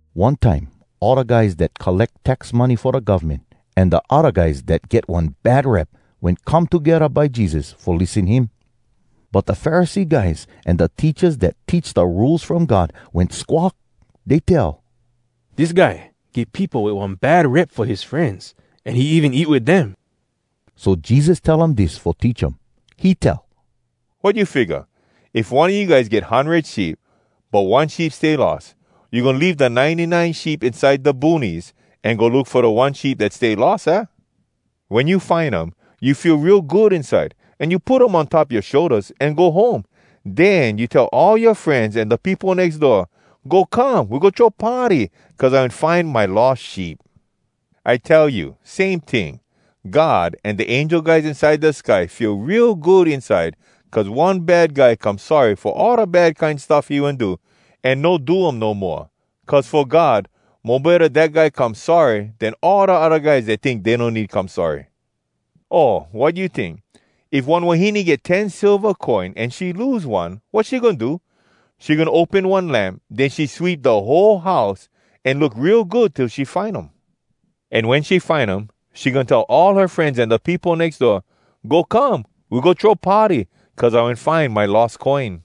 One time all da guys dat colleck tax money fo da govmen an da odda guys dat get one bad rep wen come togedda by Jesus fo lissen him. But da Pharisee guys an da teachas dat teach da Rules From God wen squawk. Dey tell, “Dis guy get peopo wit one bad rep fo his frenz, an he even eat wit dem.” So Jesus tell um dis fo teach um: He tell, “Wat you figga? If one a you guys get hundred sheep, but one sheep stay lost, you goin leave da ninety nine sheep inside da boonies, an go look fo da one sheep dat stay lost, aah? Wen you find um, you feel real good inside, an you put um on top yoa shouldas, an go home. Den you tell all yoa frenz an da peopo nex door, ‘Go come, we go throw party! Cuz I wen find my lost sheep.’ I tell you, same ting, God an da angel guys inside da sky feel real good inside cuz one bad guy come sorry fo all da bad kine stuff he wen do, an no do um no moa. Cuz fo God, mo betta dat guy come sorry, den all da odda guys dat tink dey no need come sorry.” “O, wat you tink? If one wahine get ten silva coin, an she lose one, wat she goin do? She goin open one lamp, den she sweep da whole house, an look real good till she find um. An wen she find um, she goin tell all her frenz an da peopo nex door, ‘Go come, we go throw party! Cuz I wen find my lost coin!’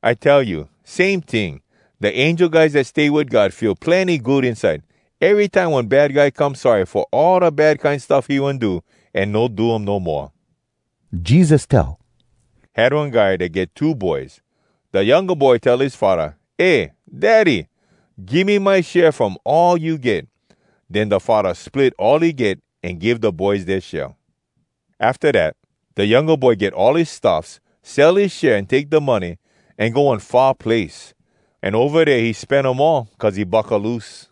I tell you, same ting, da angel guys dat stay wit God feel plenny good inside, erytime one bad guy come sorry fo all da bad kine stuff he wen do, an no do um no moa.” Jesus tell, “Had one guy dat get two boys. Da younga boy tell his faddah, ‘Eh Daddy! Give me my share from all you get.’ Den da faddah split all he get an give da boys dea share. “Afta dat, da younga boy get all his stuffs, sell his share an take da money, an go one far place. An ova dea he spen um all, cuz he buckaloose.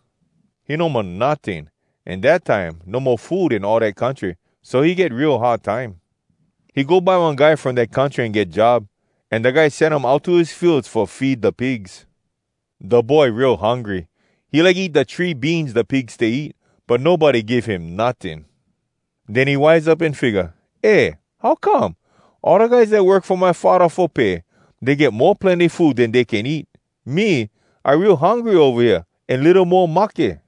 He no mo notting. An dat time no mo food in all dat country. So he get real hard time. He go by one guy from dat country an get job, an da guy sen him out to his fields fo feed da pigs. Da boy real hungry! He like eat da tree beans da pigs stay eat. But nobody give him notting! “Den he wise up an figga, ‘Eh, how come?! All da guys dat work fo my faddah fo pay, dey get mo plenny food den dey can eat. Me, I real hungry ova hea, an litto mo mahke!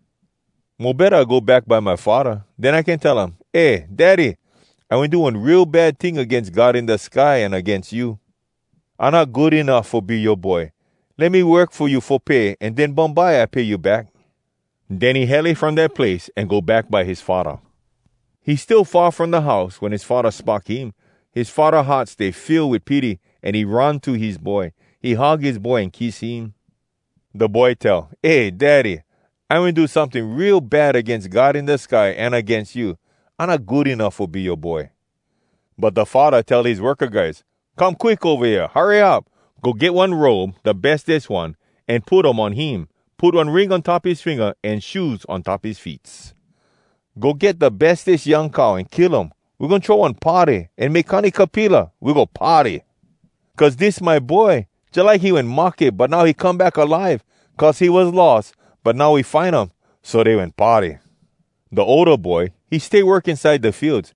Mo betta I go back by my faddah. Den I can tell um, “Eh Daddy! I wen do one real bad ting agains God in da sky an agains you. I not good enuff fo be yoa boy. Let me work fo you fo pay, an den bumbye I pay you back.” ’ Den he hele from dat place an go back by his faddah. “He still far from da house wen his faddah spock him. His faddah heart stay fill wit pity an he run to his boy. He hug his boy an kiss him. Da boy tell, ‘Eh Daddy! I wen do someting real bad agains God in da sky, an agains you. I not good enuff fo be yoa boy.’ “But da faddah tell his worka guys, ‘Come quick ova hea! Hurry up! Go get one robe, da bestes one, an put um on him. Put one ring on top his finga an shoes on top his feets. Go get da bestes young cow an kill um. We goin throw one party, an make kanikapila, we go party! Cuz dis my boy! Jalike he wen mahke, but now he come back alive! Cuz he was lost, but now we find um!’ So dey wen party. “Da older boy, he stay work inside da fields.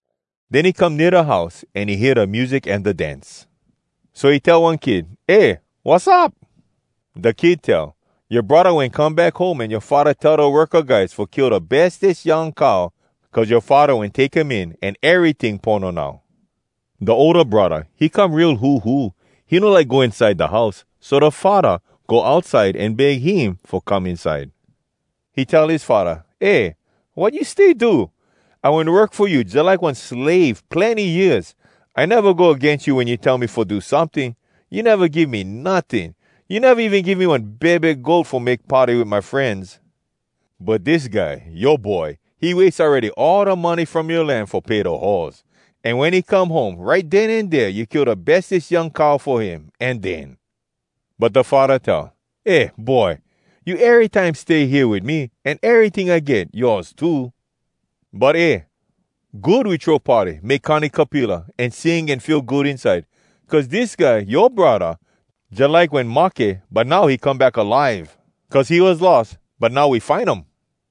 Den he come nea da house, an he hear da music an da dance. So he tell one kid, ‘Eh, wassup?’ “Da kid tell, ‘Yoa braddah wen come back home, an yoa faddah tell da worka guys fo kill da bestes young cow, cuz yoa faddah wen take him in, an eryting pono now!’ “Da older braddah, he come real huhu. He no like go inside da house. So da faddah go outside an beg him fo come inside. He tell his faddah, ‘Eh, wat you stay do! I wen work fo you jalike one slave, plenny years! I neva go agains you wen you tell me fo do someting! You neva give me notting! You neva even give me one bebe goat fo make party wit my frenz! But dis guy, yoa boy, he wase awready all da money from yoa land fo pay da hoaz. An wen he come home, right den an dea you kill da bestes young cow fo him. An den!’ “But da faddah tell, ‘Eh boy, you erytime stay hea wit me, an eryting I get, yoas too. But eh! good we throw party, make kanikapila, an sing an feel good inside! Cuz dis guy, yoa braddah, jalike wen mahke, but now he come back alive! Cuz he was lost, but now we find um!’”